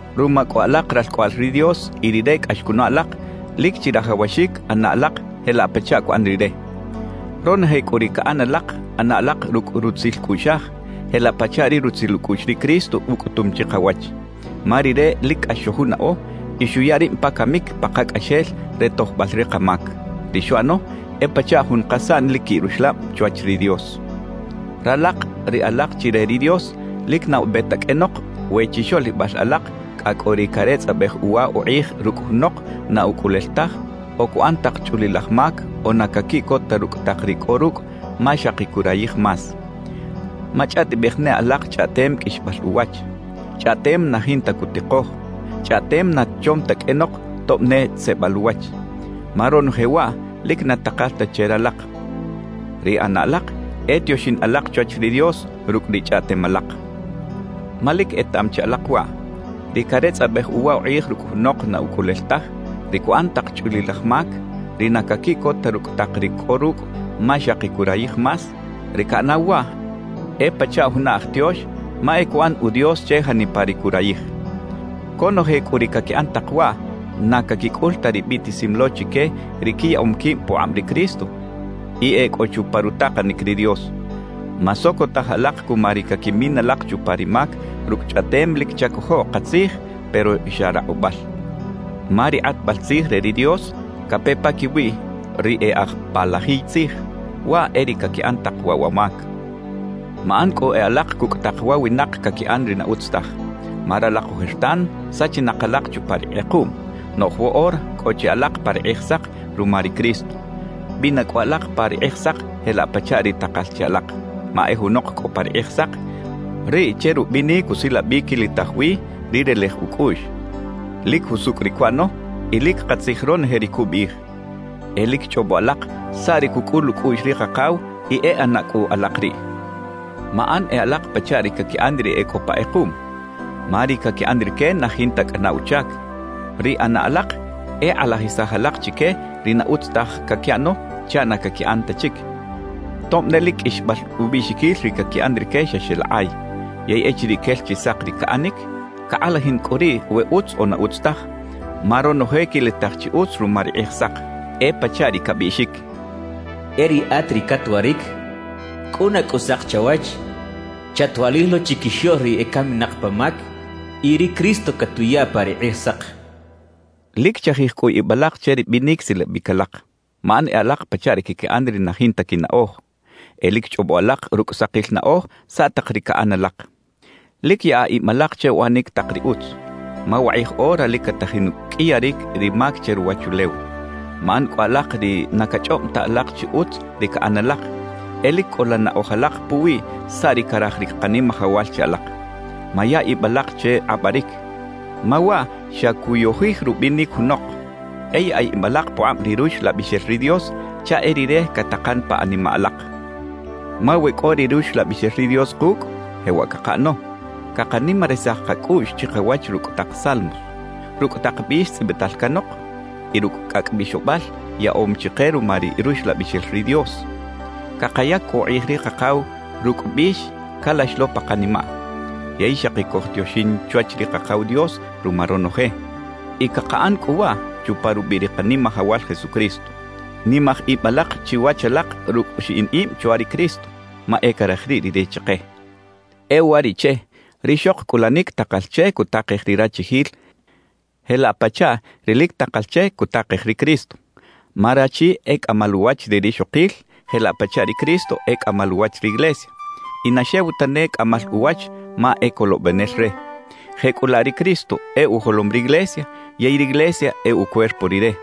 Ruma cꞌu alak ralcꞌoꞌal ri Dios y Rire cꞌax cunaꞌ alak, lic chirajawaxic ꞌana alak jelaꞌ pachaꞌ cuꞌan Rire. Ronoje cꞌu ri caꞌan alak, ꞌana alak rucꞌ rutzil cꞌuꞌxaj, jelaꞌ pachaꞌ ri rutzil ucꞌuꞌx ri Cristo ucꞌutum chikawach. Ma Rire lic cꞌax xojunaꞌo y xuya rib pa camic pakacꞌaxel re tojbal ri kamac. Ri xuꞌano e pachaꞌ jun kasaꞌn lic quiꞌ ruxlab chwach ri Dios. Ralak ri alak chi re ri Dios, lic na ube ta qꞌuenok we chixoꞌlibal alak cꞌa cꞌo ri caretzꞌabej uwa ukꞌij rucꞌ junok na ucꞌulel taj o cuꞌan tak chꞌulilaj mac o na caquiꞌcot ta rucꞌ tak ri cꞌo rucꞌ ma xaki curayij más. Machꞌaꞌtibej ne alak chꞌaꞌtem qꞌuixbal uwach, chꞌaꞌtem na jinta cutikoj, chꞌaꞌtem na chom ta qꞌuenok tob ne tzeꞌbal uwach. Ma ronoje waꞌ lic na takal ta che ralak. Ri ꞌana alak e tioxin alak chwach ri Dios rucꞌ ri chꞌaꞌtem alak. Ma lic etaꞌam chi alak waꞌ: Ri caretzꞌabej uwa ukꞌij rucꞌ junok na ucꞌulel taj, ri cuꞌan tak chꞌulilal mac, ri na caquiꞌcot ta rucꞌ tak ri cꞌo rucꞌ ma xaki curayij más, ri caꞌanaw waꞌ e pachaꞌ juna aj tiox ma e cuꞌan “udios” che janipa ri curayij; conoje cꞌu ri caquiꞌan tak waꞌ, na caquicꞌul ta ri biꞌtisim lo chique ri quiyaꞌom quib pukꞌab ri Cristo y e cꞌo chupa rutakanic ri Dios. Masocotaj alak cuma ri caquimin alak chupa ri mac rucꞌ chꞌaꞌtem lic chacojoꞌ katzij pero xa rakꞌubal. Ma ri kꞌatbal tzij re ri Dios cape paquiwi ri e aj palajiy tzij, waꞌ e ri caquiꞌan tak waꞌ wa mac. Maꞌan cꞌu e alak cucꞌ tak wa winak caquiꞌan ri na utz taj. Ma ralak ojertan sachinak alak chupa ri kꞌekuꞌm, noꞌj woꞌora cꞌo chi alak pa ri Kꞌijsak ruma ri Cristo. Bina cꞌu alak pa ri Kꞌijsak jelaꞌ pachaꞌ ri takal che alak. Ma e junok cꞌo pa ri Kꞌijsak, riꞌ che rubinic usilabic quilitaj wi ri relej ucꞌuꞌx, lic jusucꞌ ri cuꞌano y lic katzij ronoje ri cubiꞌij. E lic chꞌobo alak saꞌ ri cucꞌul ucꞌuꞌx ri Kakaw y e ꞌana cꞌu alak riꞌ. Maꞌan e alak pachaꞌ ri caquiꞌan ri e cꞌo pa kꞌekuꞌm, ma ri caquiꞌan rique na jinta cꞌana uchac. Ri ꞌana alak e kꞌalajisaj alak chique ri na utz taj caquiꞌano chaꞌ na caquiꞌan ta chic, tob ne lic qꞌuixbal ubiꞌxiquil ri caquiꞌan rique xa xeꞌlakꞌay. Yey echiriꞌ quel chi sak ri caꞌanic, cakꞌalajin cꞌu riꞌ we utz o na utz taj, ma ronoje quilitaj chi utz ruma ri Kꞌijsak. E pachaꞌ ri cabiꞌxic: E riꞌat ri catwaric, ¡cꞌuna cꞌu sak chawach! Chatwaꞌlij lo chiquixoꞌl ri ecaminak pa mac, y ri Cristo catuya pa ri Kꞌijsak. Lic chajij cꞌu ib alak che ri binic silabic alak. Maꞌan e alak pachaꞌ ri caquiꞌan ri na jinta quinaꞌoj; e lic chꞌobo alak rucꞌ sakil naꞌoj saꞌ tak ri caꞌan alak. Lic yaꞌa ib alak che uꞌanic tak ri utz, ma wakꞌij ora lic catajin uqꞌuiyaric ri mac che ruwachulew. Maꞌan cꞌu alak ri na cachꞌob ta alak chi utz ri caꞌan alak; e lic cꞌola naꞌoj alak puwi saꞌ ri caraj ri Kanimajawal che alak. Maya ib alak che kꞌabaric, ma waꞌ xa cuyojij rubinic junok. E yaꞌa ib alak pukꞌab ri Ruxlabixel ri Dios chaꞌ e Rire catakan pa animaꞌ alak. Ma we cꞌo ri Ruxlabixel ri Dios kucꞌ, jewaꞌ cakaꞌano: Cakanimarisaj kacꞌuꞌx chikawach rucꞌ tak salmos, rucꞌ tak bix tzꞌibital canok y rucꞌ cꞌacꞌ bixobal yaꞌom chike ruma ri Ruxlabixel ri Dios. Cakayac cꞌu ukꞌij ri Kakaw rucꞌ bix calax lo pa kanimaꞌ. Yey xaki cojtioxin chwach ri Kakaw Dios ruma ronoje, y cakaꞌan cꞌu waꞌ chupa rubiꞌ ri Kanimajawal Jesucristo. Nimaj ib alak chiwach alak rucꞌ xiꞌin ib chwa ri Cristo, ma e caraj riꞌ Rire chike. E uwariꞌche, rixok cꞌulanic takal che cutakej ri rachijil jelaꞌ pachaꞌ ri lic takal che cutakej ri Cristo. Ma rachi e cꞌamal uwach ri rixokil jelaꞌ pachaꞌ ri Cristo e cꞌamal uwach riglesia y na xew tane cꞌamal uwach ma e Colobenel re. Jecꞌulaꞌ ri Cristo e ujolom riglesia yey riglesia e ucuerpo Rire.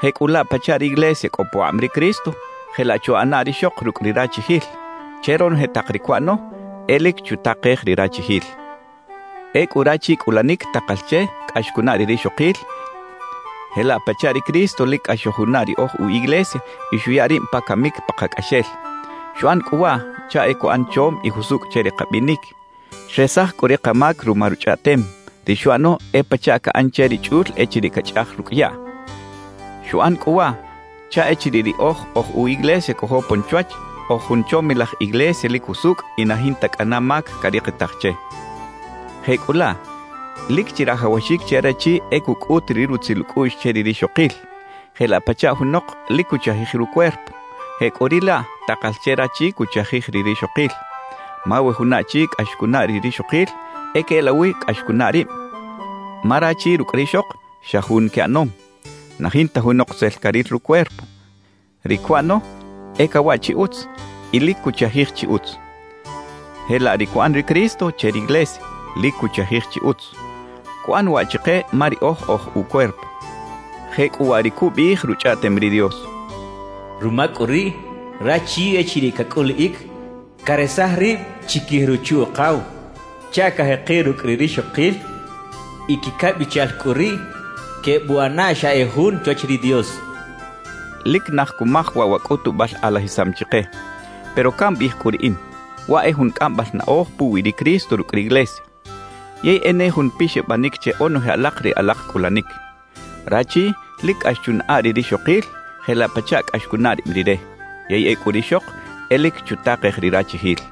Jecꞌulaꞌ pachaꞌ riglesia cꞌo pukꞌab ri Cristo, jelaꞌ chuꞌana rixok rucꞌ ri rachijil; che ronoje tak ri cuꞌano, e lic chutakej ri rachijil. Ecꞌu rachi cꞌulanic takal che cꞌax cunaꞌ ri rixokil jelaꞌ pachaꞌ ri Cristo lic cꞌax xojunaꞌ ri oj u iglesia y xuya rib pa camic pakacꞌaxel. Xuꞌan cꞌu waꞌ chaꞌ e cuꞌan chom y jusucꞌ che ri kabinic. Xresaj cꞌu ri kamac ruma Ruchꞌaꞌtem; ri xuꞌano e pachaꞌ caꞌan che ri chꞌul echiriꞌ cachꞌaj rucꞌ yaꞌ. Xuꞌan cꞌu waꞌ chaꞌ echiriꞌ riꞌoj oj u iglesia cojopon chwach, oj jun chomilaj iglesia lic jusucꞌ y na jinta cꞌana mac carikitaj che. Jecꞌulaꞌ lic chirajawaxic che rachi e cucꞌut ri rutzil ucꞌuꞌx che ri rixokil. Jelaꞌ pachaꞌ junok lic cuchajij rucuerpo, jecꞌuriꞌlaꞌ takal che rachi cuchajij ri rixokil. Ma we juna achi cꞌax cunaꞌ ri rixokil, e queꞌelawi cꞌax cunaꞌ rib, ma rachi rucꞌ rixok, xa jun quiꞌanom. Na jinta junok tzel caril rucuerpo; ri cuꞌano e cawaꞌ chi utz y lic cuchajij chi utz. Jelaꞌ ri cuꞌan ri Cristo che riglesia, lic cuchajij chi utz. Cuꞌan waꞌ chike ma riꞌoj oj ucuerpo. Jecꞌuwaꞌ ri cubiꞌij Ruchꞌaꞌtem ri Dios: Ruma cꞌu riꞌ, rachi echiriꞌ cacꞌuliꞌic, caresaj rib chiquij ruchu-ukaw chaꞌ cajekiꞌ rucꞌ ri rixokil y quicabichal cꞌu riꞌ quebuꞌana xa e jun chwach ri Dios cachaꞌ. Lic naj cumaj waꞌ wa cꞌutubal kꞌalajisam chike; pero cambiꞌij cꞌu riꞌin, waꞌ e jun cꞌambal naꞌoj puwi ri Cristo rucꞌ riglesia. Yey e ne jun pixabanic che onoje alak ri alak cꞌulanic. Rachi lic cꞌax chunaꞌa ri rixokil jelaꞌ pachaꞌ cꞌax cunaꞌ rib rire, yey ecꞌu rixok e lic chutakej ri rachijil.